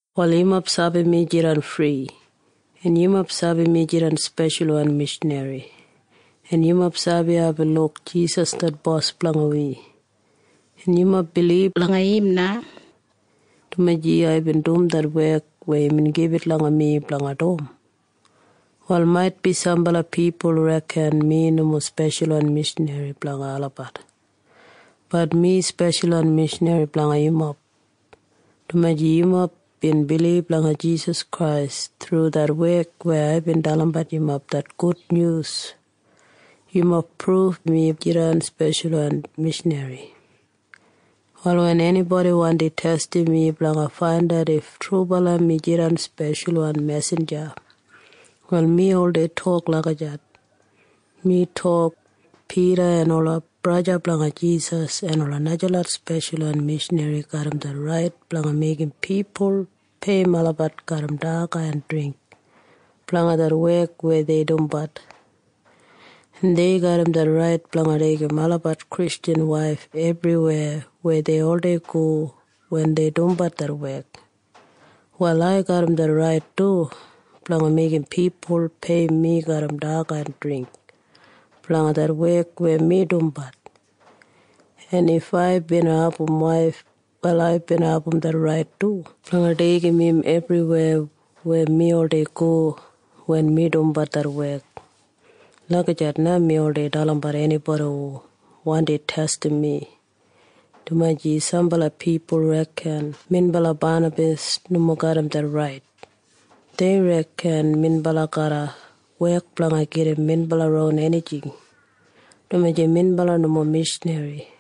Wal yumob sabi mi jidan fri, en yumob sabi mi jidan speshalwan mishanri, en yumob sabi aibin luk Jisas det Bos blanga wi, en yumob bilib langa im na, dumaji aibin dum det wek weya imbin gibit langa mi blanga dum. Wal maitbi sambala pipul reken mi nomo speshalwan mishanri blanga olabat. Bat mi speshalwan mishanri blanga yumob, dumaji yumob bin bilib langa Jisas Krais thru det wek weya aibin dalimbat yumob det gudnyus. Yumob pruf mi jidan speshalwan mishanri. Wal wen enibodi wandi testim mi blanga faindat if trubala mi jidan speshalwan mesinja, wal mi oldei tok lagijat. Mi tok, “Pida en ola braja blanga Jisas en ola najalot speshalwan mishanri garram det rait blanga meigim pipul peiyim olabat garram daga en dringk blanga det wek weya dei dumbat. En dei garram det rait blanga deigim olabat Kristjan waif ebriweya weya dei oldei go wen dei dumbat det wek. Wal ai garram det rait du blanga meigim pipul peiyim mi garram daga en dringk blanga det wek weya mi dumbat. En if ai bina abum waif, wal ai bina abum det rait du blanga deigim im ebriweya weya mi oldei go wen mi dumbat det wek.” Lagijat na mi oldei dalimbat enibodi hu wandi testim mi, dumaji sambala pipul reken minbala Banabas nomo garram det rait. Dei reken minbala garra wek blanga gedim minbala ron enijing, dumaji minbala nomo mishanri.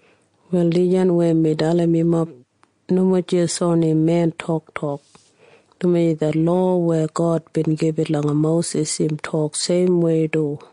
Wal dijan weya mi dalim yumob nomo jis oni men toktok, dumaji det lowa weya God bin gibit langa Mosis im tok seimwei du.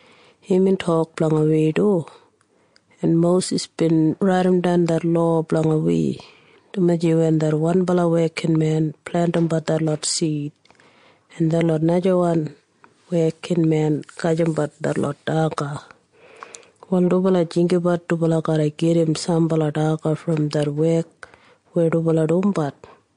Imbin tok blanga wi du, en Mosis bin raidimdan det lowa blanga wi, dumaji wen det wanbala wekinmen plentimbat detlot sid en det najawan wekinmen gajimbat detlot daga, wal dubala jinggabat dubala garra gedim sambala daga brom det wek weya dubala dumbat.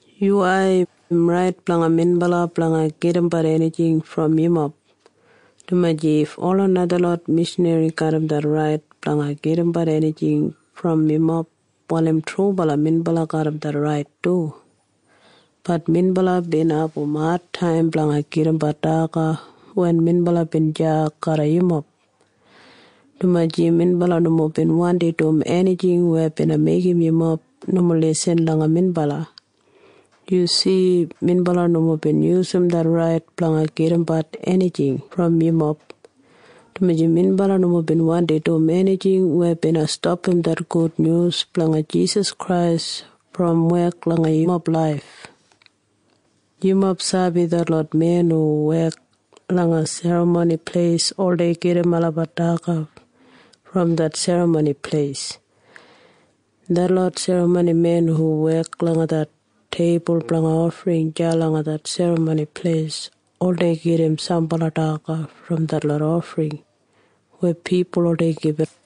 Yuwai. Im rait blanga minbala blanga gedimbat enijing brom yumob, dumaji if ola najalot mishanri garram det rait blanga gedimbat enijing brom yumob, wal im trubala minbala garram det rait du. Bat minbala bin abum adtaim blanga gedimbat daga wen minbala bin deya garram yumob, dumaji minbala nomo bin wandi dum enijing weya bina meigim yumob nomo lisin langa minbala. Yu si? Minbala nomo bin yusum det rait blanga gedimbat enijing brom yumob, dumaji minbala nomo bin wandi dum enijing weya bina stapam det Gudnyus blanga Jisas Krais brom wek langa yumob laif. Yumob sabi detlot men hu wek langa Serramoni Pleis oldei gedim olabat daga brom det Serramoni Pleis, en detlot serramonimen hu wek langa det teibul blanga ofring deya langa det Serramoni Pleis oldei gedim sambala daga brom det ofring weya pipul oldei gibit.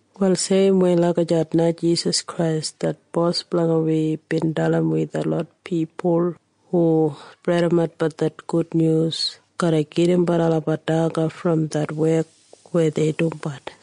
Wal seimwei lagijat na Jisas Krais det Bos blanga wi bin dalim wi detlot pipul hu spredimatbat det gudnyus garra gedimbat olabat daga brom det wek weya dei dumbat.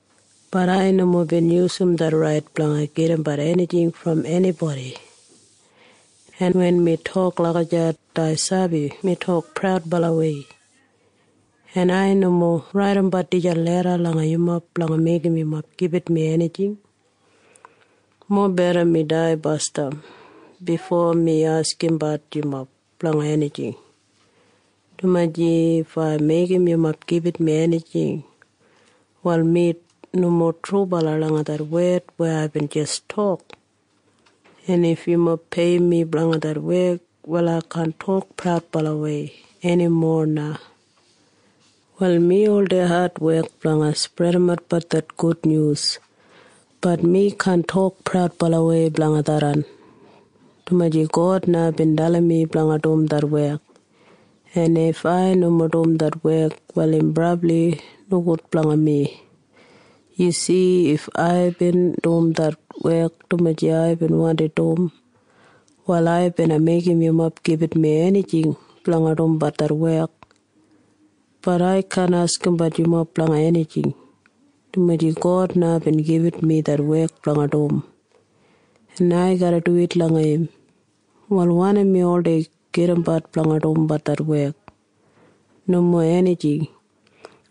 Bat ai nomo bin yusum det rait blanga gedimbat enijing brom enibodi. En wen mi tok lagijat, ai sabi mi tok praudbalawei. En ai nomo raidimbat dijan leda langa yumob blanga meigim yumob gibit mi enijing. Mobeda mi dai basdam bifo mi askimbat yumob blanga enijing, dumaji if ai meigim yumob gibit mi enijing, wal mi nomo trubala langa det wed weya aibin jis tok. En if yumob peiyim mi blanga det wek, wal ai kaan tok praudbalawei enimo na. Wal mi oldei adwek blanga spredimatbat det gudnyus. Bat mi kaan tok praudbalawei blanga tharran, dumaji God na bin dalim mi blanga dum det wek. En if ai nomo dum det wek, wal im brabli nogud blanga mi. Yu si? If aibin dum det wek dumaji aibin wandi dum, wal ai bina meigim yumob gibit mi enijing blanga dumbat det wek. Bat ai kaan askimbat yumob blanga enijing, dumaji God na bin gibit mi det wek blanga dum, en ai garra duwit langa im. Wal wanim mi oldei gedimbat blanga dumbat det wek? Nomo enijing,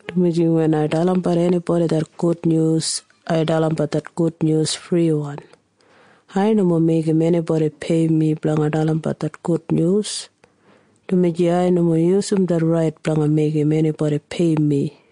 dumaji wen ai dalimbat enibodi det gudnyus, ai dalimbat det gudnyus friwan. Ai nomo meigim enibodi peiyim mi blanga dalimbat det gudnyus, dumaji ai nomo yusum det rait blanga meigim enibodi peiyim mi.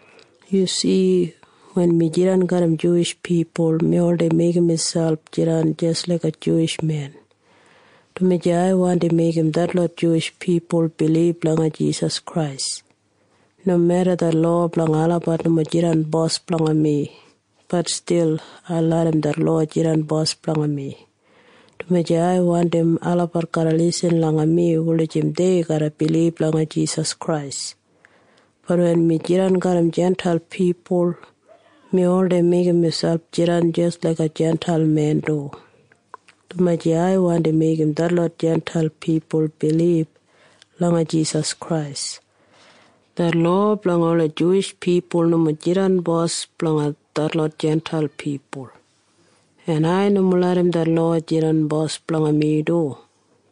Yu si? Wen mi jidan garram Juwish pipul, mi oldei meigim miselp jidan jis laiga Juwish men, dumaji ai wandi meigim detlot Juwish pipul bilib langa Jisas Krais. Nomeda det lowa blanga olabat nomo jidan bos blanga mi, bat stil ai larram det lowa jidan bos blanga mi, dumaji ai wandim olabat garra lisin langa mi wulijim dei garra bilib langa Jisas Krais. Bat wen mi jidan garram Jintail pipul, mi oldei meigim miselp jidan jis laiga Jintail men du, dumaji ai wandi meigim detlot Jintail pipul bilib langa Jisas Krais. Det lowa blanga ola Juwish pipul nomo jidan bos blanga detlot Jintail pipul, en ai nomo larram det lowa jidan bos blanga mi du,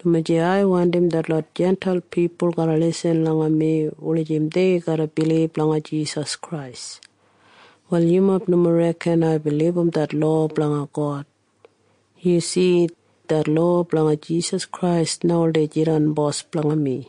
dumaji ai wandim detlot Jintail pipul garra lisin langa mi wulijim dei garra bilib langa Jisas Krais. Wal yumob nomo reken aibin libum det lowa blanga God. Yu si? Det lowa blanga Jisas Krais na oldei jidan bos blanga mi.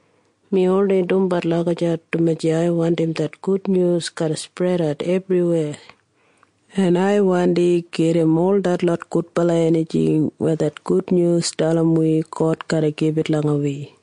Mi oldei dumbat lagijat, dumaji ai wandim det gudnyus garra spredat ebriweya, en ai wandi gedim ol detlot gudbala enijing weya det gudnyus dalim wi God garra gibit langa wi.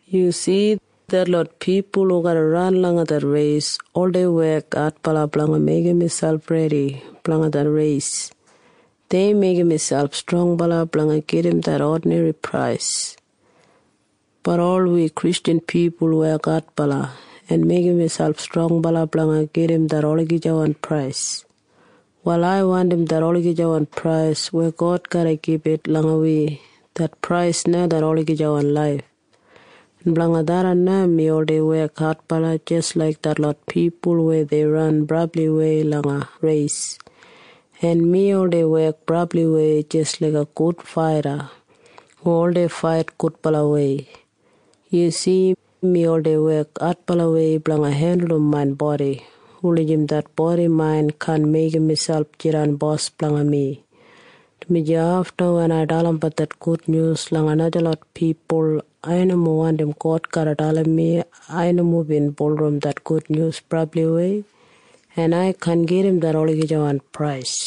Yu si? Detlot pipul hu garra ran langa det reis oldei wek adbala blanga meigim miselp redi blanga det reis. Dei meigim miselp strongbala blanga gedim det odinri prais. Bat ol wi Kristjan pipul wek adbala en meigim miselp strongbala blanga gedim det olagijawan prais. Wal ai wandim det olagijawan prais weya God garra gibit langa wi. Det prais na det olagijawan laif. En blanga tharran na mi oldei wek adbala jis laik detlot pipul weya dei ran brabliwei langa reis, en mi oldei wek brabliwei jis laiga gud faita hu oldei fait gudbalawei. Yu si? Mi oldei wek adbalawei blanga hendulum main bodi wulijim det bodi main kaan meigim miselp jidan bos blanga mi, dumaji afta wen ai dalimbat det gudnyus langa najalot pipul, ai nomo wandim God garra dalim mi ai nomo bin bulurrum det gudnyus brabliwei en ai kaan gedim det olagijawan prais.